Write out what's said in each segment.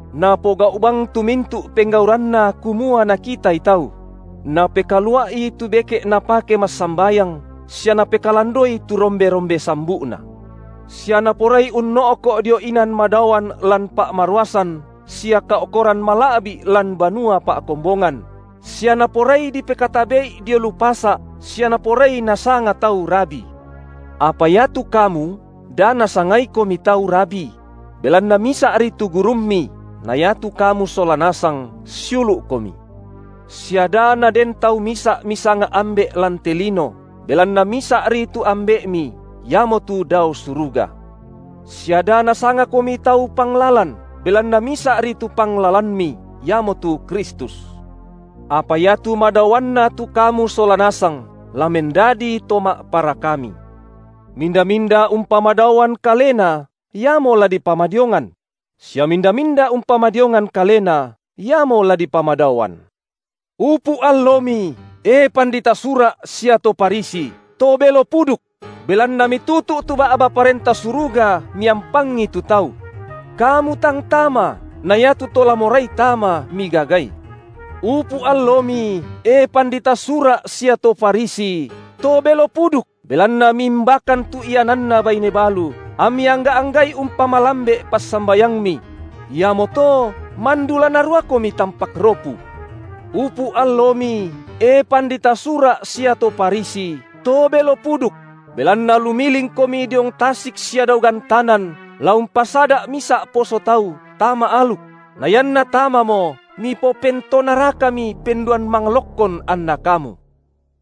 Napogau’ bang tu mintu’ penggauranna kumua nakitai tau; napekalua’i tu beke’ napake massambayang sia napekalandoi tu rombe-rombe sambu’na. Sia naporai unno’ko’ dio inan madaoan lan pa’maruasan sia kao’koran mala’bi’ lan banua pa’kombongan, sia naporai dipekatabe’i dio lu pasa’, sia naporai nasanga tau Rabi. Apa iatu kamu da nasangaikomi tau Rabi: Belanna Misa’ri tu Gurummi, na iatu kamu sola nasang siulu’komi. Sia da naden tau misa’ misanga ambe’ lan te lino, belanna Misa’ri tu Ambe’mi, Iamotu dao suruga. Sia da nasangakomi tau panglalan, belanna Misa’ri tu Panglalanmi, Iamotu Kristus. Apa iatu madaoanna tu kamu sola nasang, la mendadi to ma’parakami. Minda-minda umpamadaoan kalena, iamo la dipamadiongan; sia minda-minda umpamadiongan kalena, iamo la dipamadaoan. Upu’ allomi, e pandita Sura’ sia to Farisi, to belo puduk! belanna mitutu’ tu ba’ba Parenta Suruga miampangi tu tau. Kamu tang tama, na iatu to la morai tama migagai. (Upu’ allomi, e pandita Sura’ sia to Farisi, to belo puduk, belanna miimbakan tu iananna baine balu, ammi angga’-angga’i umpamalambe’ passambayangmi; iamoto mandu la naruakomi tampak ropu.) Upu’ allomi, e pandita Sura’ sia to Farisi, to belo puduk! Belanna lumilingkomi diong tasik sia dao gantanan la umpasada’ misa’ poso tau tama aluk; na ianna tamamo mipopentonarakami penduan manglokkon anna kamu.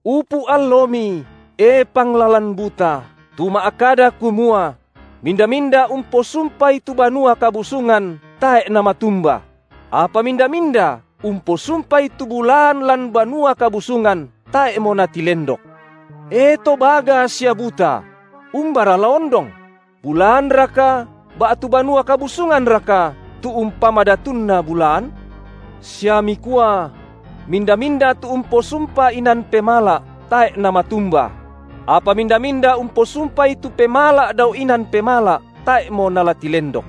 Upu’ allomi, e panglalan buta, tu ma’kada kumua: Minda-minda umposumpai tu Banua Kabusungan, tae’ namatumba; apa minda-minda, umposumpai tu bulaan lan Banua Kabusungan, tae’mo natilendok. E to baga sia buta! Umbara la ondong: bulaanraka ba’tu banua kabusunganraka tu umpamadatunna bulaan? Sia mikua: Minda-minda tu umposumpa inan pemala’, tae’ namatumba; apa minda-minda umposumpai tu pemala’ dao inan pemala’, tae’mo nala tilendok.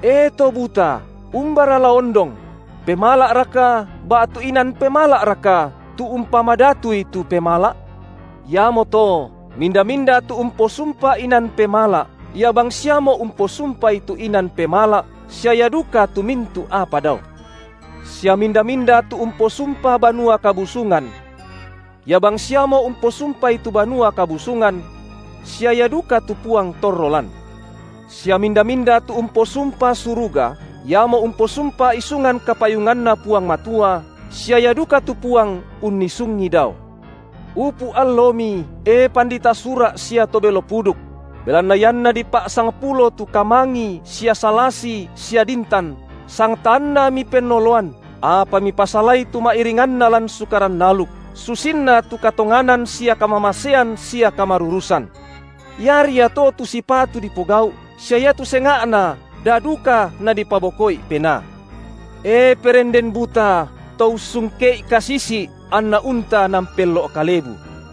E to buta, umbara la ondong: pemala’raka ba’tu inan pemala’raka, tu umpamadatui tu pemala’? Iamoto, minda-minda tu umposumpa inan pemala’, ia bangsiamo umposumpai tu inan pemala’ sia ia duka tu mintu’ apa dao. Sia minda-minda tu umposumpa Banua Kabusungan, ia bangsiamo umposumpai tu Banua Kabusungan sia ia duka tu Puang torro lan. Sia minda-minda tu umposumpa suruga, iamo umposumpa isungan kapayunganNa Puang Matua sia Ia duka tu Puang unnisungi dao. Upu’ allomi, e pandita Sura’ sia to belo puduk! Belanna ianna dipa’sangpulo tu kamangi sia salasi sia dintan, sangtaanna mipennoloan, apa mipasalai tu ma’iringanna lan Sukaran aluk, susinna tu katonganan sia kamamasean sia kamarurusan. Iari ia to tu sipatu dipogau’ sia iatu senga’na da duka nadipaboko’i penaa. E perenden buta, to ussungke’i kasisi’, anna unta naampello’ kalebu.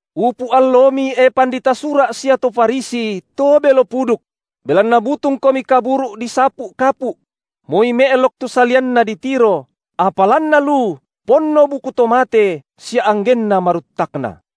Upu’ allomi, e pandita Sura’ sia to Farisi, to belo puduk! Belanna butungkomi kaburu’ disapu’ kapu’; moi me’lok tu salianna ditiro, apa lanna lu ponno buku to mate sia anggenna maruttakna.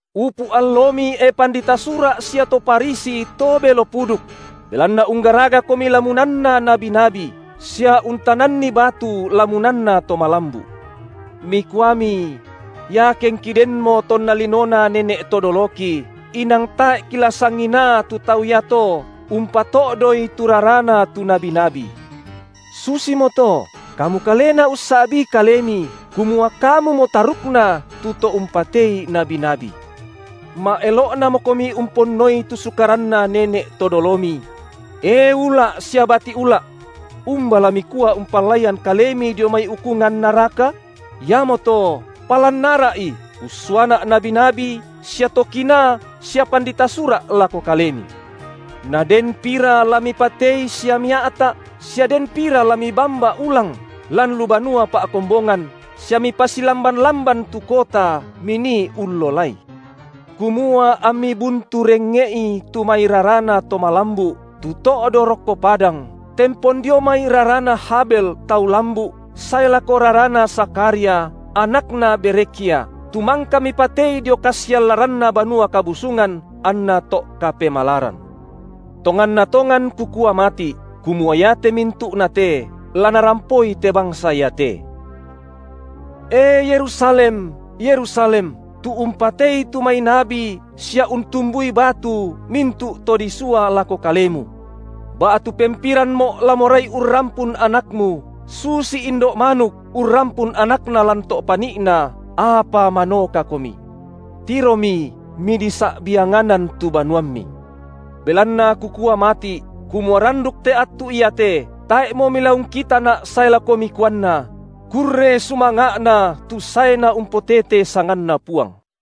Upu’ allomi, e pandita Sura’, sia to Farisi to belo puduk! Belanna unggaragakomi lamunanna nabi-nabi, sia untananni batu lamunanna to malambu’. Mikuami: Iakengki denmo tonna linona nene’ to doloki, inang tae’ kila sanginaa tu tau iato umpato’doi tu rarana tu nabi-nabi. Susimoto, kamu kalena ussa’bii kalemi, kumua kamumo tarukna tu to umpatei nabi-nabi. Ma’elo’namokomi umponnoi tu sukaranna nene’ to dolomi! E ula’ sia bati’ ula’. Umba la mikua umpallaian kalemi dio mai ukungan naraka? Iamoto palan ara’i, ussuaNa’ nabi-nabi sia to kinaa sia pandita Sura’ lako kalemi. Na den pira la mipatei sia mia’ta’, sia den pira la mibamba ulang lan lu banua pa’kombongan sia mipasilamban-lamban tu kota minii ullolai. Kumua ammi buntu rengnge’i tu mai rarana to malambu’ tu to’do rokko padang, tempon dio mai rarana Habel tau lambu’ sae lako rarana Zakharia, anakna Berekhya, tu mangka mipatei dio kasiallaranna banua kabusungan anna to’ kapemalaran. Tonganna tongan Kukua mati’, kumua iate mintu’na te la narampoi te bangsa iate. E Yerusalem, Yerusalem, tu umpatei tu mai nabi sia untumbui batu mintu’ to disua lako kalemu. Ba’tu pempiranMo’ la morai urrampun anakmu, susi indo’ manuk urrampun anakna lan to’ pani’na, apa manokakomi. Tiromi midisa’bianganan tu banuammi. Belanna Kukua mati’, kumua randuk te attu iate, tae’mo milaungkitaNa’ sae lako mikuanna: Kurre sumanga’na tu saeNa umpotete sanganNa Puang.